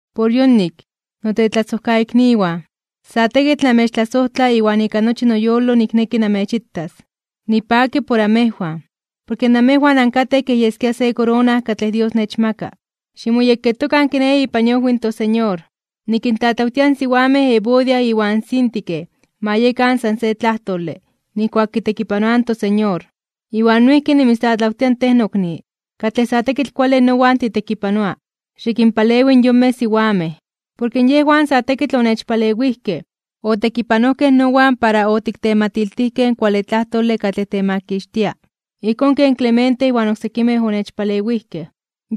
Por yonik, notetlasojkaikniwan, sa tekitl namechtlasojtla iwan ika nochi noyolo nikneki namechitas. Nipaki por amejwan, porke namejwan ankatej kej yeskia se korona katlej Dios nechmaka. Ximoyekketokan kiné ipan iojwi in toSeñor. Nikintlatlawtia in siwamej Evodia iwan Síntique ma yekan san se tlajtole (de akuerdo) nijkuak kitekipanoaj in toSeñor. Iwan noijki nimitztlatlawtia tej nokni, katlej sa tekitl kuale nowan titekipanoa, xikinpalewi in yonmej siwamej. Porke yejwan sa tekitl onechpalewijkej, otekipanojkej nowan para otiktematiltijkej in kuale tlajtole katlej temakixtia ijkón ken Clemente iwan oksekimej onechpalewijkej.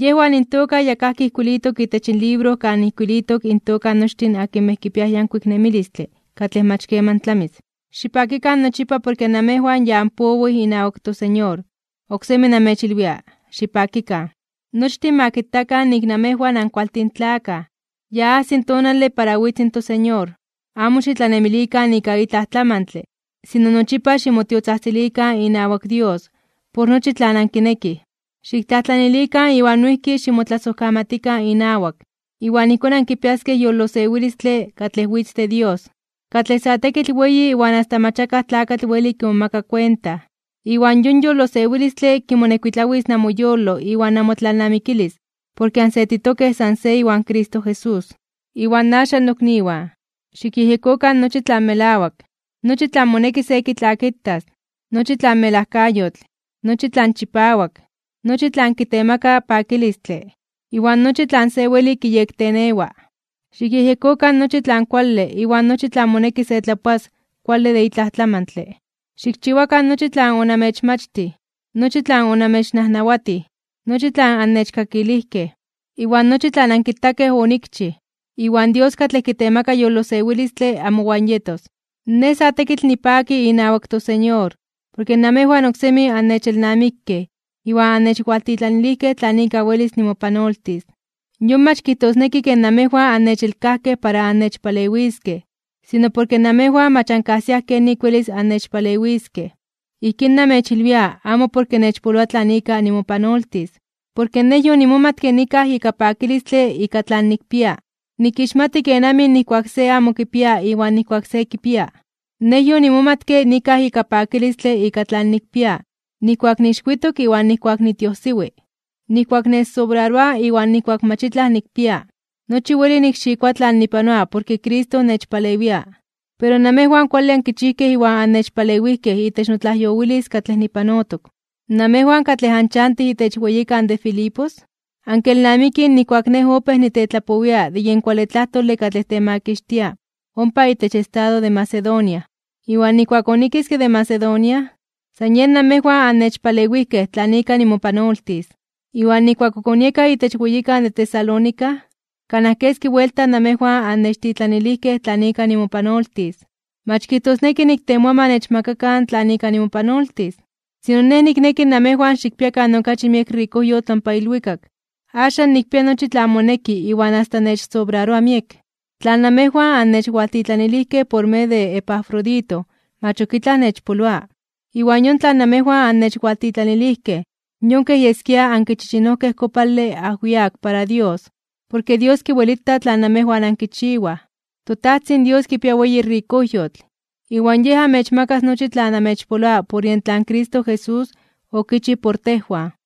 Yejwan intoka ya kajki ijkuilitok itech libro kan ijkuilitok intoka nochtin akinmej kipiaj yankuik nemilistle katlej mach keman tlamis. Xipakikan nochipa porke namejwan ya anpowij inawak toSeñor. Oksemi namechilwia: ¡Xipakikan! Nochtin ma kitakan nik namejwan ankualtin tlakaj. Ya ajsi tonale para witz in toSeñor. Amo xitlanemilikan ika itlaj tlamantle, sino nochipa ximotiotzajtzilikan inawak Dios por nochi tlan ankinekij. Xiktlajtlanilikan iwan noijki ximotlasojkamatikan inawak. Iwan ijkón ankipiaskej yolosewilistle katlej witz de Dios, katlej sa tekitl weyi iwan asta mach akaj tlakatl weli kimomaka kuenta. Iwan yon yolosewilistle kimonekuitlawis namoyolo iwan namotlalnamikilis porke ansetitokej san se iwan Cristo Jesús. Iwan axan nokniwan, xikyejyekokan nochi tlan melawak, nochi tlan moneki se kitlakitas, nochi tlan melajkayotl, nochi tlan chipawak, nochi tlan kitemaka pakilistle, iwan nochi tlan se weli kiyektenewa. Xikyejyekokan nochi tlan kuale iwan nochi tlan moneki se tlapoas kuale de itlaj tlamantle. Xikchiwakan nochi tlan onamechmachtij, nochi tlan onamechnajnawatij, nochi tlan annechkakilijkej, iwan nochi tlan ankitakej onikchij. Iwan Dios katlej kitemaka yolosewilistle amowan yetos. Nej sa tekitl nipaki inawak toSeñor, porke namejwan oksemi annechelnamikej iwan annechwaltitlanilijkej tlan ika welis nimopanoltis. Yon mach kijtosneki ke namejwan annechelkajkej para annechpalewiskej, sino porke namejwan mach ankajsiaj kenik welis annechpalewiskej. Ijkín namechilwia amo porke nechpoloa tlan ika nimopanoltis, porke nej yonimomatke nikaj ika pakilistle ika tlan nikpia. Nikixmati kenamij nijkuak se amo kipia iwan nijkuak se kipia. Nej yonimomatke nikaj ika pakilistle ika tlan nikpia, nijkuak niixwitok iwan nijkuak nitiojsiwi, nijkuak nechsobraroa iwan nijkuak mach itlaj nikpia. Nochi weli nikxikoa tlan nipanoa porke Cristo nechpalewia. Pero namejwan kuale ankichijkej iwan annechpalewijkej itech notlajyowilis katlej nipanotok. Namejwan katlej anchantij itech weyikan de Filipos, ankelnamikij nijkuak nej opéj nitetlapowia de yen kuale tlajtole katlej temakixtia ompa itech estado de Macedonia. Iwan nijkuak onikiske de Macedonia, san yen namejwan annechpalewijkej tlan ika nimopanoltis. Iwan nijkuak ok onieka itech weyikan de Tesalónica, kanaj keski buelta namejwan annechtitlanilijkej tlan ika nimopanoltis. Mach kijtosneki niktemoa ma nechmakakan tlan ika nimopanoltis, sino nej nikneki namejwan xikpiakan okachi miek rikojyotl ompa ilwikak. Axan nikpia nochi tlan moneki iwan asta nechsobraroa miek. Tlan namejwan annechwaltitlanilijkej por medio de Epafrodito mach ok itlaj nechpoloa, iwan yon tlan namejwan annechwaltitlanilijkej yon kej yeskia ankichichinojkej kopale ajwiak para Dios, porke Dios kiwelita tlan namejwan ankichiwaj. ToTajtzin Dios kipia weyi rikojyotl, iwan Yej amechmakas nochi tlan amechpoloa por yen tlan Cristo Jesús okichij por tejwan.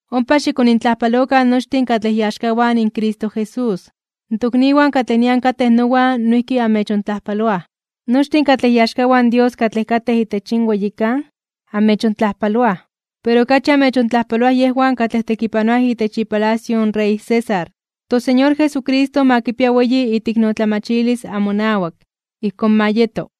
Ompa xikonintlajpalokan nochtin katlej iaxkawan in Cristo Jesús. Tokniwan katlej nian katej nowan noijki amechontlajpaloaj. Nochtin katlej iaxkawan in Dios katlej katej itech yin weyikan, amechontlajpaloaj. Pero okachi amechontlajpaloaj yejwan katlej tekipanoaj itech ipalacio in rey César. ToSeñor Jesucristo ma kipia weyi iteiknotlamachilis amonawak. Ijkón ma yeto.